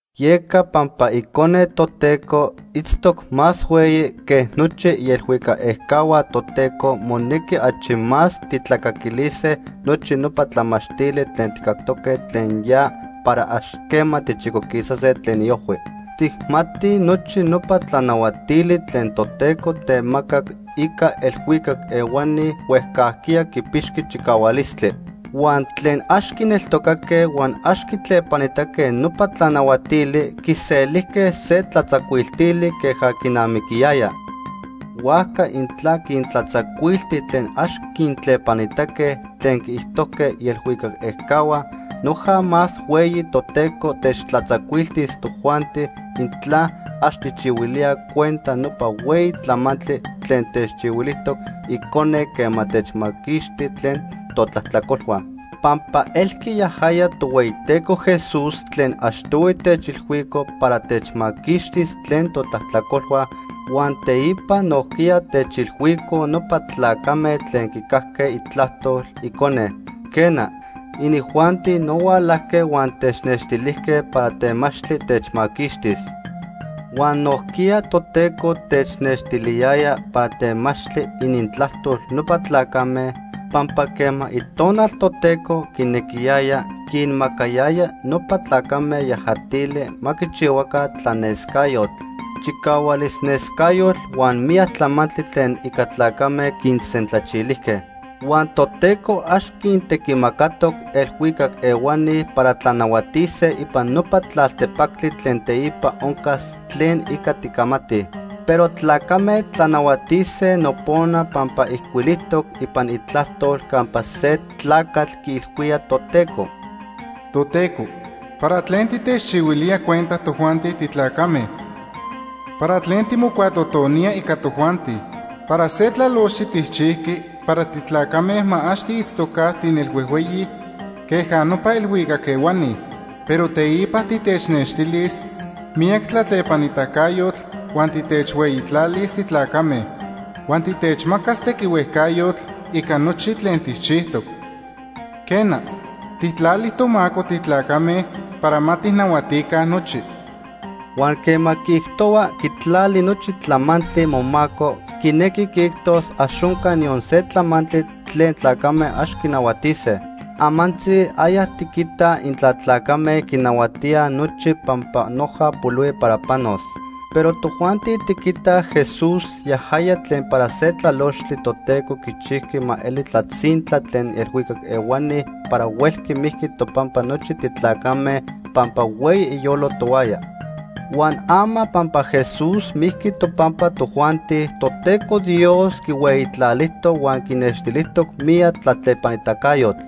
Yeca pampa Icone Toteco itztoc más hueyi que nochi ielhuicac ejcahua Toteco, monequi achi más tijtlacaquilise nochi nopa tlamachtili tlen tijcactoque tlen ya para ax quema tichicoquisase tlen iojhui. Tijmatij nochi nopa tlanahuatili tlen Toteco temacac ica elhuicac ehuani huejcajquiya quipixqui chicahualistli. Huan tlen ax quineltocaque huan ax quintlepanitaque nopa tlanahuatili, quiselijque se tlatzacuiltili queja quinamiquiyaya. Huajca intla quintlatzacuilti tlen ax quintlepanitaque tlen quiijtojque ielhuicac ejcahua, noja más hueyi Toteco techtlatzacuiltis tojuanti intla ax tijchihuilíaj cuenta nopa hueyi tlamantli tlen techchihuilijtoc Icone quema techmaquixti tlen totlajtlacolhua. Pampa elqui yajaya Tohueyiteco Jesús tlen achtohui techilhuico para techmaquixtis tlen totlajtlacolhua, huan teipa nojquiya techilhuicoj nopa tlacame tlen quicajque itlajtol Icone. Quena, inijuanti no hualajque huan technextilijque para temachtli techmaquixtis. Huan nojquiya Toteco technextiliyaya para temachtli inintlajtol nopa tlacame, pampa quema Itonal Toteco quinequiyaya, quinmacayaya nopa tlacame yajatili ma quichihuaca tlanescayotl, chicahualis nescayotl huan miyac tlamantli tlen ica tlacame quinsentlachilijque. Huan Toteco ax quintequimacatoc elhuicac ehuani para tlanahuatise ipan nopa tlaltepactli tlen teipa oncas tlen ica ticamatij. Pero tlacame tlanahuatise nopona pampa ijcuilijtoc ipan Itlajtol campa se tlacatl quiilhuía Toteco: “Toteco, ¿para tlen titechchihuilía cuenta tojuanti titlacame? ¿Para tlen timocuatotonía ica tojuanti? Para se tlalochtli tijchijqui para titlacame ma ax tiitztoca tinelhuejhueyi queja nopa elhuicac ehuani. Pero teipa titechnextilis miyac tlatlepanitacayotl huan titechhueyitlalis titlacame. Huan titechmacas tequihuejcayotl ica nochi tlen tijchijtoc. Quena, tijtlali tomaco titlacame para ma tijnahuatica nochi.” Huan quema quiijtohua quitlali nochi tlamantli momaco, quinequi quiijtos ax onca niyon se tlamantli tlen tlacame ax quinahuatise. Amantzi aya tiquitaj intla tlacame quinahuatíaj nochi pampa noja polihui para panos. Pero tojuanti tiquitaj Jesús, yajaya tlen para se tlalochtli Toteco quichijqui ma eli tlatzintla tlen elhuicac ehuani para huelqui mijqui topampa nochi titlacame pampa hueyi iyolo tohuaya. Huan ama pampa Jesús mijqui topampa tojuanti, Toteco Dios quihueyitlalijtoc huan quinextilijtoc miyac tlatlepanitacayotl.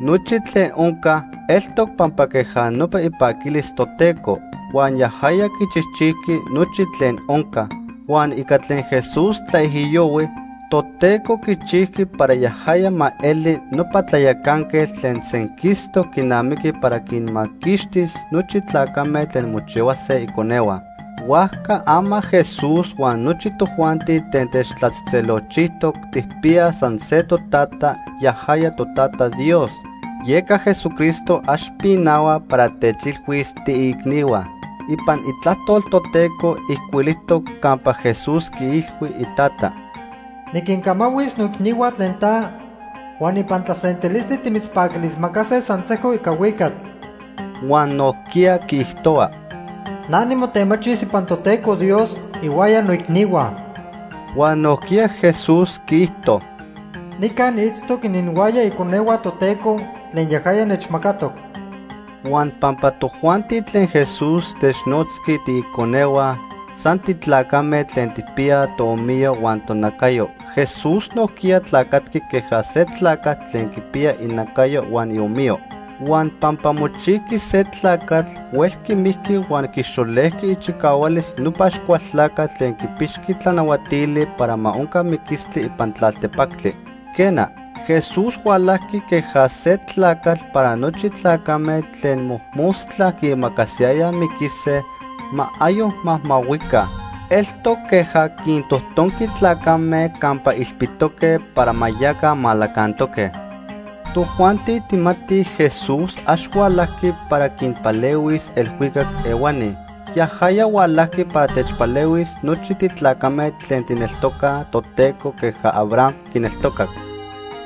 Nochi tlen onca, eltoc pampa queja nopa ipaquilis Toteco. Huan yajaya quichijchijqui nochi tlen onca. Huan ica tlen Jesús tlaijiyohui, Toteco quichijqui para yajaya ma eli nopa tlayacanquetl tlen senquistoc quinamiqui para quinmaquixtis nochi tlacame tlen mochihuase iconehua. Huajca ama Jesús huan nochi tojuanti tlen techtlatzejtzelolchijtoc tijpiyaj san se totata, yajaya, toTata Dios. Yeca Jesucristo ax pinahua para techilhuis tiiicnihua. Ipan Itlajtol Toteco ijcuilijtoc campa Jesús quiilhui iTata: “Niquincamahuis noicnihua tlen ta, huan ipan tlasentilistli timitzpaquilismacase san sejco ica huicatl.” Huan nojquiya quiijtohua: “Na nimotemachis ipan Toteco Dios ihuaya noicnihua.” Huan nojquiya Jesús quiijto: “Nica niitztoc ininhuaya iconehua Toteco tlen yajaya nechmacatoc.” Huan pampa tojuanti tlen Jesús technotzqui “tiiconehua” san titlacame tlen tijpiyaj toomiyo huan tonacayo, Jesús nojquiya tlacatqui queja se tlacatl tlen quipiya inacayo huan iomiyo. Huan pampa mochijqui se tlacatl, huelqui mijqui huan quixolejqui ichicahualis nopa Axcualtlacatl tlen quipixqui tlanahuatili para ma onca miquistli ipan tlaltepactli. Quena, Jesús hualajqui queja se tlacatl para nochi tlacame tlen mojmostla quiimacasiyayaj miquise, ma ayoc majmahuica. Eltoc queja quintojtonqui tlacame campa ilpitoque para ma yaca malacantoque. Tojuanti tijmatij Jesús ax hualajqui para quinpalehuis elhuicac ehuani. Yajaya hualajqui para techpalehuis nochi titlacame tlen tijneltocaj Toteco queja Abraham quineltocac.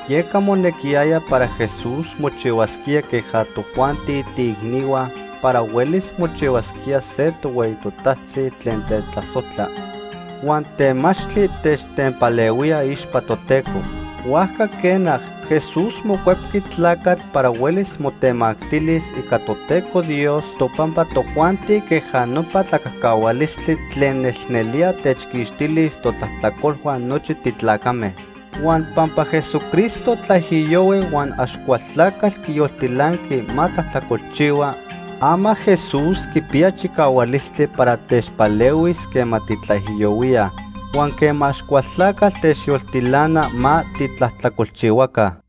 Yeca monequiyaya para Jesús mochihuasquía queja tojuanti tiiicnihua para huelis mochihuasquía se tohueyi totajtzi tlen tetlasojtla huan temachtli techtenpalehuía iixpa Toteco. Huajca quena, Jesús mocuepqui tlacatl para huelis motemactilis ica Toteco Dios topampa tojuanti queja nopa tlacajcahualistli tlen nelnelía techquixtilis totlajtlacolhua nochi titlacame. Huan pampa Jesucristo tlaijiyohui huan Axcualtlacatl quiyoltilanqui ma tlajtlacolchihua, ama Jesús quipiya chicahualistli para techpalehuis quema titlaijiyohuíaj huan quema Axcualtlacatl techyoltilana ma titlajtlacolchihuaca.